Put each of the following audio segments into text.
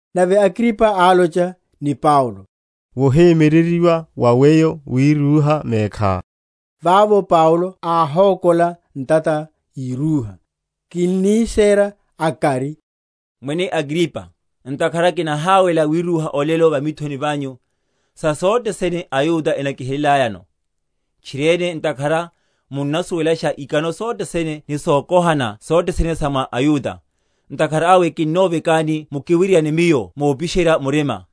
Nave Agripa álocha ni Paulo, Wohemyereryiwa wa weyo wirúha mekhá. Vavo Paulo, áhokola ntata írúha: Kinnisera akari, Mwene Agripa, ntakhara kinahawela wirúha olelo va mithoni vanyu, sa sothe sene aYuda enakihelelayano; tchiriene ntakhara munnasuwelasha ikano sothene ni sokohana sothene sa mwa aYuda; ntakhara awe kinnovekani mukiwiriane miyo mopisherya murima.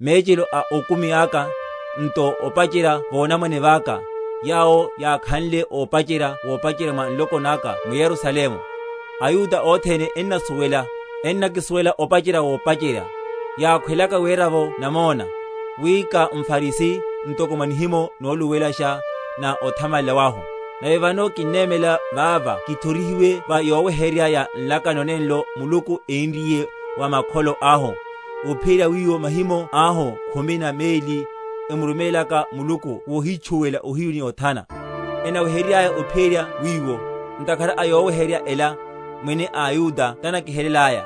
Mechelo a okumi aka, nto, opacherya vonamwane vaka, yawo yákhanle opacherya wopacherya mwa nloko naka m’Yerusalemu, aYuda othene ennasuwela; ennakisuwela opacherya wopacherya, yakhwelaka werela’vo namona, wi ká mFarisi ntoko mwa nihimo noluluwelasha na othamalela wahu. Nave vano kinnemela vava kithorihiwe va yoweheryerya ya nlakano nenlo Muluku énriye wa makholo ahu; ophiyerya wiwo mahimo ahu khumi na meli, emurumélaka Muluku wohítchúwela ohiyu ni othana, ennaweheryerya ophiyerya wiwo. Ntakhara a yoweheryerya ela, Mwene, aYuda tanakihelelaya.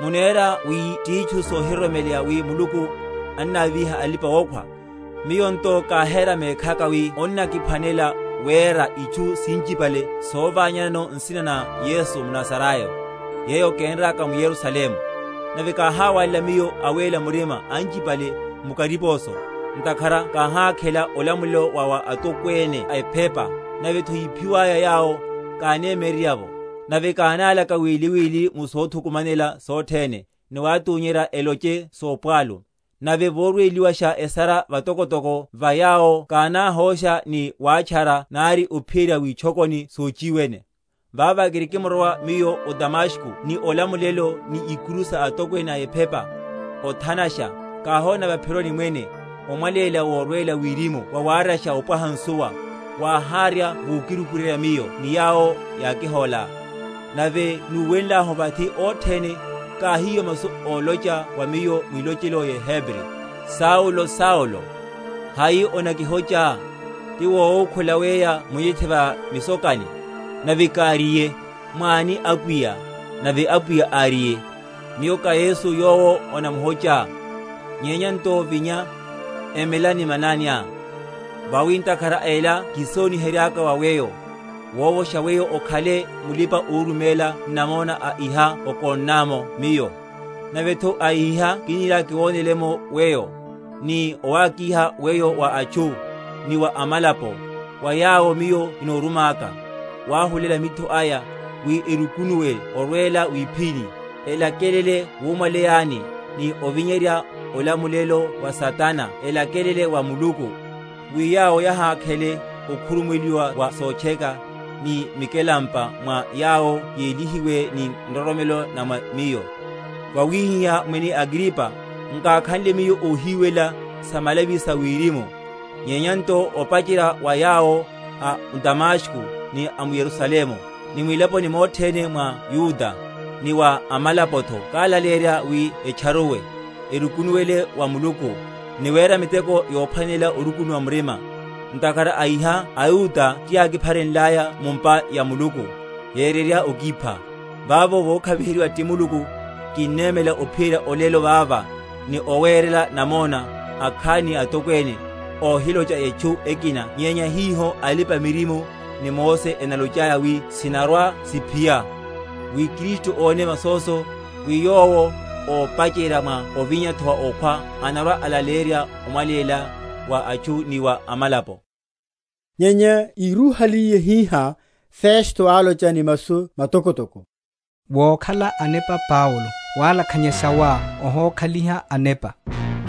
Munera wi titchu yohiroromeleya, wi Muluku annavíha alipa‐okhwa? Miyo nto káhera mekhaka, wi onnakiphwanela wera itchu sinchipale sovanyanano nsina na Yesu mNazarayo. Yeyo kénraka m’Yerusalemu: nave káháwalela miyo awéla‐murima anchipale mu kariposo, ntakhara káhákhela olamulelo wa wa atokwene a ephepa; nave’tho yíphiwaya yawo, káne?-?myererya’vo. Nave kánálaka wili wili mu sothukumanela sothene, ni watunyerya eloche sopwalu; nave vorweliwasha esara vatokotoko va yawo kánáhosha ni watchara nari ophiyerya witchokoni sochiwene. Vava kirikimrowa miyo o Damasko ni olamulelo ni ikuru sa atokwene a ephepa, othanasha, káhona va’phironi, Mwene, omwaléla worwela wirimu wawaryasha opwaha nsuwa, wáharya vokirukuryerya miyo ni yawo yákihóla. Nave núwenlahu vathi othene, káhiwa masu olocha wa miyo mwilochelo yeHebri, Saulo, Saulo, hai onakihochá? ti wowukhula weya munyethe va misokani. Nave káriye, Mwáni Apwiya? Nave Apwiya áriye, Miyo ká Yesu yowo onamuhochá. Nyenya nto vinya, emela ni mananiá; vawi ntakhara a ela kísonihenryaka wa weyo, wovosha weyo okhale mulipa‐oruméla n’namona a iha okonná’mo Miyo, nave’tho a iha kiniriaka kiwonele’mo weyo; ni owakiha weyo wa atchu, ni wa amalapo, wa yawo Miyo kino?-?rumaka, wahulela mitho aya, wi erukunuwe orwela wipiphini, elakelele wumwaleyani, ni ovinyerya olamulelo wa Satana elakelele wa Muluku, wi yawo yahakhele okhurumuweliwa wa sotcheka, ni mikelampa mwa yawo yelihiwe ni nroromelo na mwa Miyo. Vawihihá, Mwene Agripa, nkákhanle miyo óhiwelela samalavi sa wirimu; nyenya nto opacherya wa yawo a m’Damasko, ni a m’Yerusalemu, ni mwilaponi mothe mwene mwa Yudeya, ni wa amalapo’tho kálaleyerya wi etcharuwe, erukunuwele wa Muluku, ni wera miteko yophwanela orukunuwa murima. Ntakhara a iha aYuda tiyákipharenlaya mu’mpa ya Muluku, yererya okipha. Vavo vokhaviheryiwa ti Muluku, kinnemela ophiyerya olelo vava, ni owerela namona akhani ni atokwene, óhilocha etchu ekina nyenya hiho alipa‐miririmo ni Mose enalochaya wi sinarwa‐siphiya; wi Kristu óne masoso, wi yowo, ópacherya, mwa ovinya’tho wa okhwa, anarwa‐alaleyerya omwaleya wa atchu ni wa amalapo. Nyenya írúhaliye hihá, Festo álocha ni masu matokotoko, Wokhala anepa Paulo; walakhanyasha wá wohokhaliha anepa.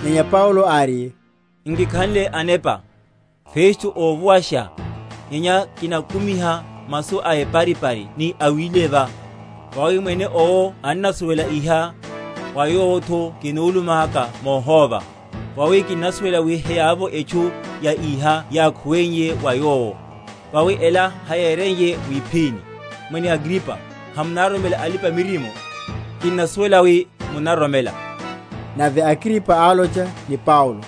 Nyenya Paulo áriye, Nkikhanle anepa, Festo óvuwasha; nyenya kinakumiha masu éparipari ni awileva. Vawi mwene owo annasuwela iha, wa yowo’tho kinulumaka móhóva: vawi kinnasuwela wi heyavovo etchu ya iha yákhuweiye wa yowo; vawi ela hayéreiye wiphini. Mwene Agripa, hamunaroromela alipa‐miririmo? kinnasuwela wi munnaroromela. Nave Agripa álocha ni Paulo,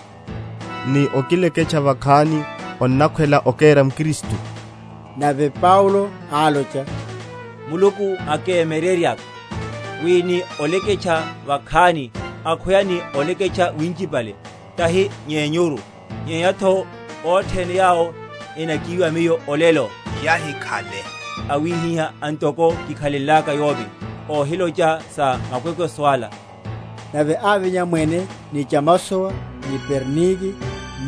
Ni okileketcha vakhani onnakhwela okéra mKristu. Nave Paulo álocha, Muluku akáhemyererya, wi ni oleketcha vakhani, akhweya ni oleketcha winchipale, tahi yenyuru, nyenya’tho othene yawo enakiwa miyo olelo, yahikhale awihiha antoko kikhalenlaka yomi, óhilocha sa makwekweso ala. Nave ávinya mwene, ni chamasowa, ni Bernike,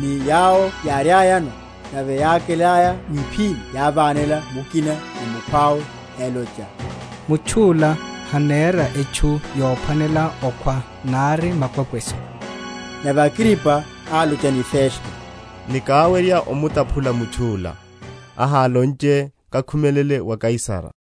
ni yawo yáriayano; nave yákelaya wiphini yávanela mukina ni mukhwawe, elocha, Mutchu’la hanera etchu yophwanela okhwa, nari makwekweso. Nave Agripa álocha ni Festo, Nikáwerya omutaphula mutchu’la, ahálonche, Kakhumelele wa Kaisara.